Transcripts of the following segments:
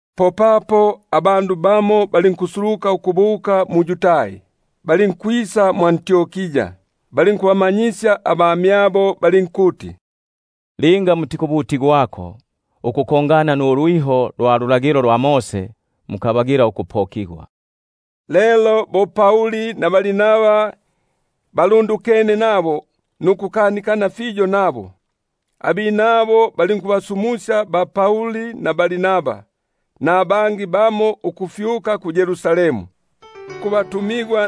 Popapo abandu bamo balinkusuluka ukufuma mu-Yudai, balinkubamanyisya abamyabo ukuti: Linga mutikubutigwako ukufwana nulwiho lwa Mose mukabagila ukupokigwa. Lelo bo Pauli na Barnaba balundukene nukukanikana fiyo nabo, abinabo balinkubasumusya Pauli na Barnaba nabangi bamo ukufyuka ku-Yerusalemu kubatumigwa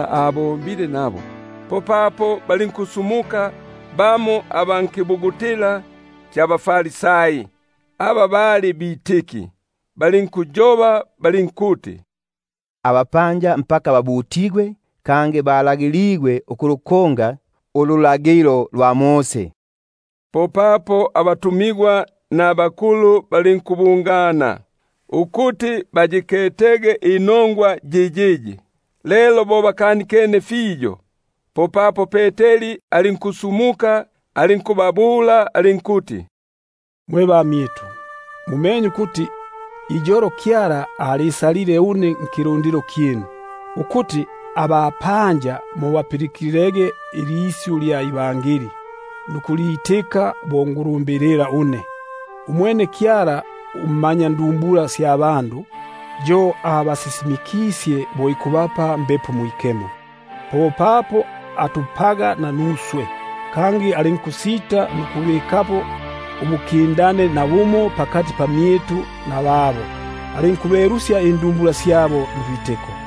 abombile nabo. Popapo balinkusumuka bamo aba nkapanga ka baFarisai, aba balipelile bitiki, balinkuyoba balinkuti: Fikuti babutigwengeko, kangi balagiligwege ukulukonga ululagilo lwa Mose. Popapo abatumigwa nabakulumba balinkubungana, ukuti bayikete inongwa yiyiyi. Lelo bo bakanikene fiyo, popapo Peteri alinkusumuka alinkubabula alinkuti: Mwe bamyitu, mumenye ukuti iyolo Kyala asalile mmyinu ukuti abapanja balipilikilege ilisyu lya nongwa inunu mundomo gwangu, nukusitika. Umwene Kyala ummanyandumbula, yo abasisimikisye bo ikubapa Mbepo Mwikemo, bo papo atupaga nanuswe. Kangi alinkusita nukubikapo ulukindano pakati pamyitu nababo, alinkubelusya indumbula syabo ndwitiko.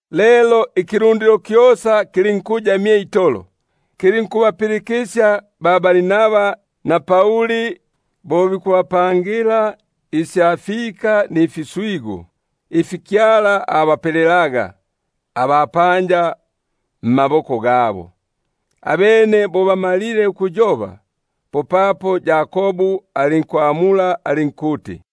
Lelo ikilundilo kyosa lulinkuya mye itolo, kilinkubapilikisya ba-Barnaba na Pauli bo bikubapangila isya fika mfiswigu, ifi Kyala abapelelaga abapanja mmaboko gabo. Abene bo bamalile ukuyoba, popapo Yakobu alinkwamula alinkuti: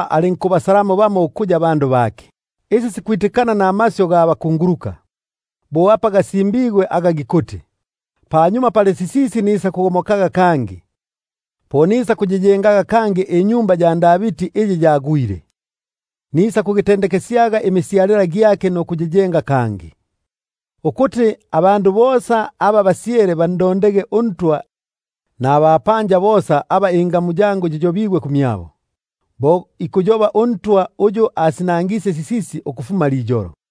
mmyabo abandu aba kuya ba ngamu yake. Isi sikwitikana namasyu ga bakunguluka, bo apa gasimbigwe ukuti: Panyuma pali sisisi, nisakugomokaga kangi, Po nisakuyengaga kangi inyumba ya Davidi iyi yagwile, Nimisyalila gyake nisakwandisyaga ukugiyenga Nisakuyimikaga kangi; Ukuti abandu aba basyele bandondege uNtwa, Nabapanja bosa aba ingamu yangu yiyobigwe kumyabo; Bo ikuya uNtwa, uyu asinangisye sisisi ukufuma liyolo.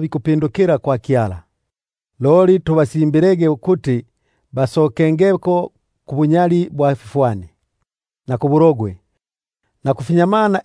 bikupindukila kwa Kyala. Loli tubasimbilege ukuti bepukeko kubunyali bwa fifwani, na kubuhahani, na kufinyamana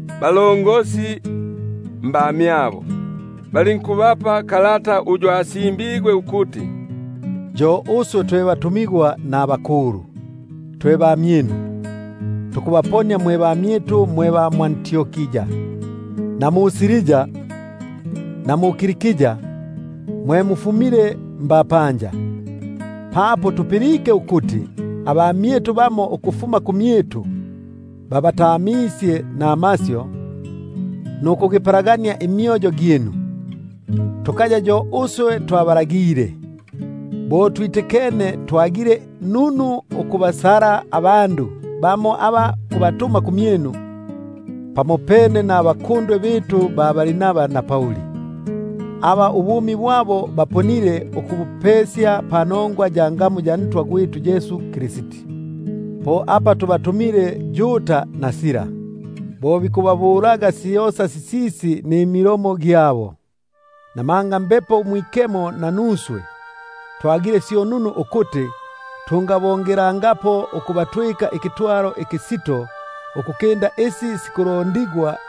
abalongosi mbamyabo; balinkubapa kalata ugwa kukolela mmaboko, uyu asimbigwe ukuti: Yo uswe twe batumigwa na twe bakulumba, twe bamyinu, tukubaponia mwe bamyitu, mwe ba mwʼAntiokia, na Siria, na Kilikia, mwe mufumile mbapanja. Papo tupilike ukuti bamo mmyitu babatamisye namasyu, nukugipalangania imyoyo gyinu, aba tukabalagile, bo twitikene, twagile nunu ukubasala abandu aba kubatuma kumyinu, pamopene nabakundwe bitu Barnaba na Pauli; aba ubumi bwabo babutagile panongwa ya ngamu ya Ntwa gwitu Yesu Kristi. Po apa tubatumile Yuda na Sila, bo bikuba- bulaga syosa sisisi mmilomo gyabo. Namanga Mbepo Mwikemo nanuswe, twagile syo nunu ukuti tungabongelelangapo ukubatwika ikitwalo ikisito ukukinda isi sikulondigwa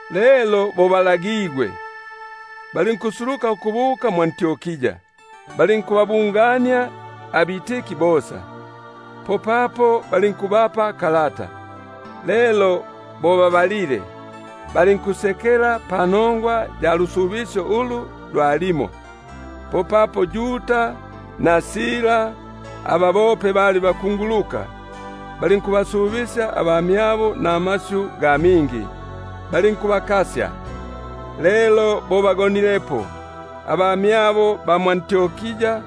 Lelo bo babasumwisye, balinkusuluka ukubuka mwʼAntiokia; abene bo bababungenie abandu, popapo balinkubapa kalata. Lelo bo babalile, balinkusekela panongwa ya lusu- bisyo ulu lwalimo. Popapo Yuda na Sila aba bope bali bakunguluka, balinkubasubisya abamyabo namasyu ga mingi, balinkubakasya. Lelo bo bagonilepo, popapo abamyabo balinkubasumusya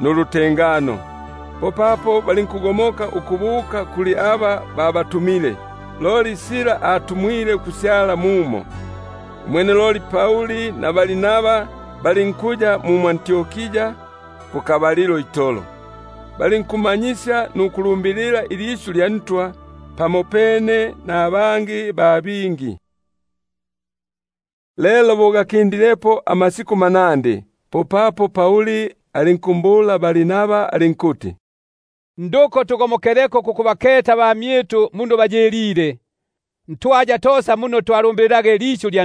nulutengano ukugomokela kuli aba babatu- mile. [Loli Sila alinkwaga ukuti kununu ukusyala mumo.] Umwene loli Pauli na Barnaba bo balinkuya mu mwʼAntiokia, balinkumanyisya nukulumbilila ilisyu lya Ntwa pamopene nabangi ba bingi. Lelo bo gakindilepo amasiku manandi, popapo Pauli alinkumbula Barnaba alinkuti: Nduko tugomokeleko kukubaketa abamyitu ntwaya tosa muno twalumbilile ilisyu lya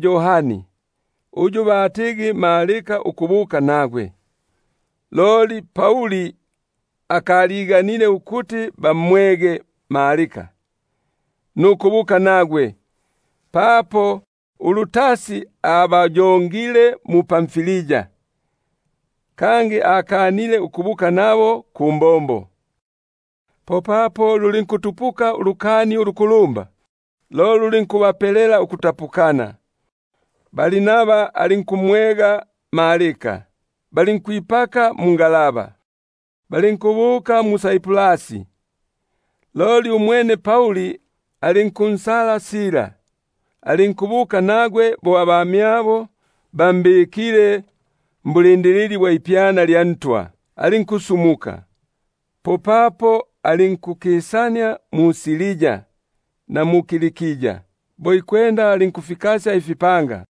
Yohani, uyu batigi Marko ukubuka nagwe. Loli Pauli alinkwaga kukaya kununu ukumwega nukubuka nagwe, uyu ayongile mu-Pamfilia, kangi akanile ukubuka nabo kumbombo. Popapo lulinkutupuka ulukani ulukulumba, lo lulinkubapelela ukutapukana. Barnaba alinkumwega Marko, balinkwipaka mungalaba, balinkubuka mu-Saiprasi. Loli umwene Pauli alinkunsala Sila, alinkubuka nagwe, bo abamyabo bambikile mwipyana lya Ntwa. Popapo alinkukisania mu-Siria na mu-Kilikia, alinkufikasya ifipanga.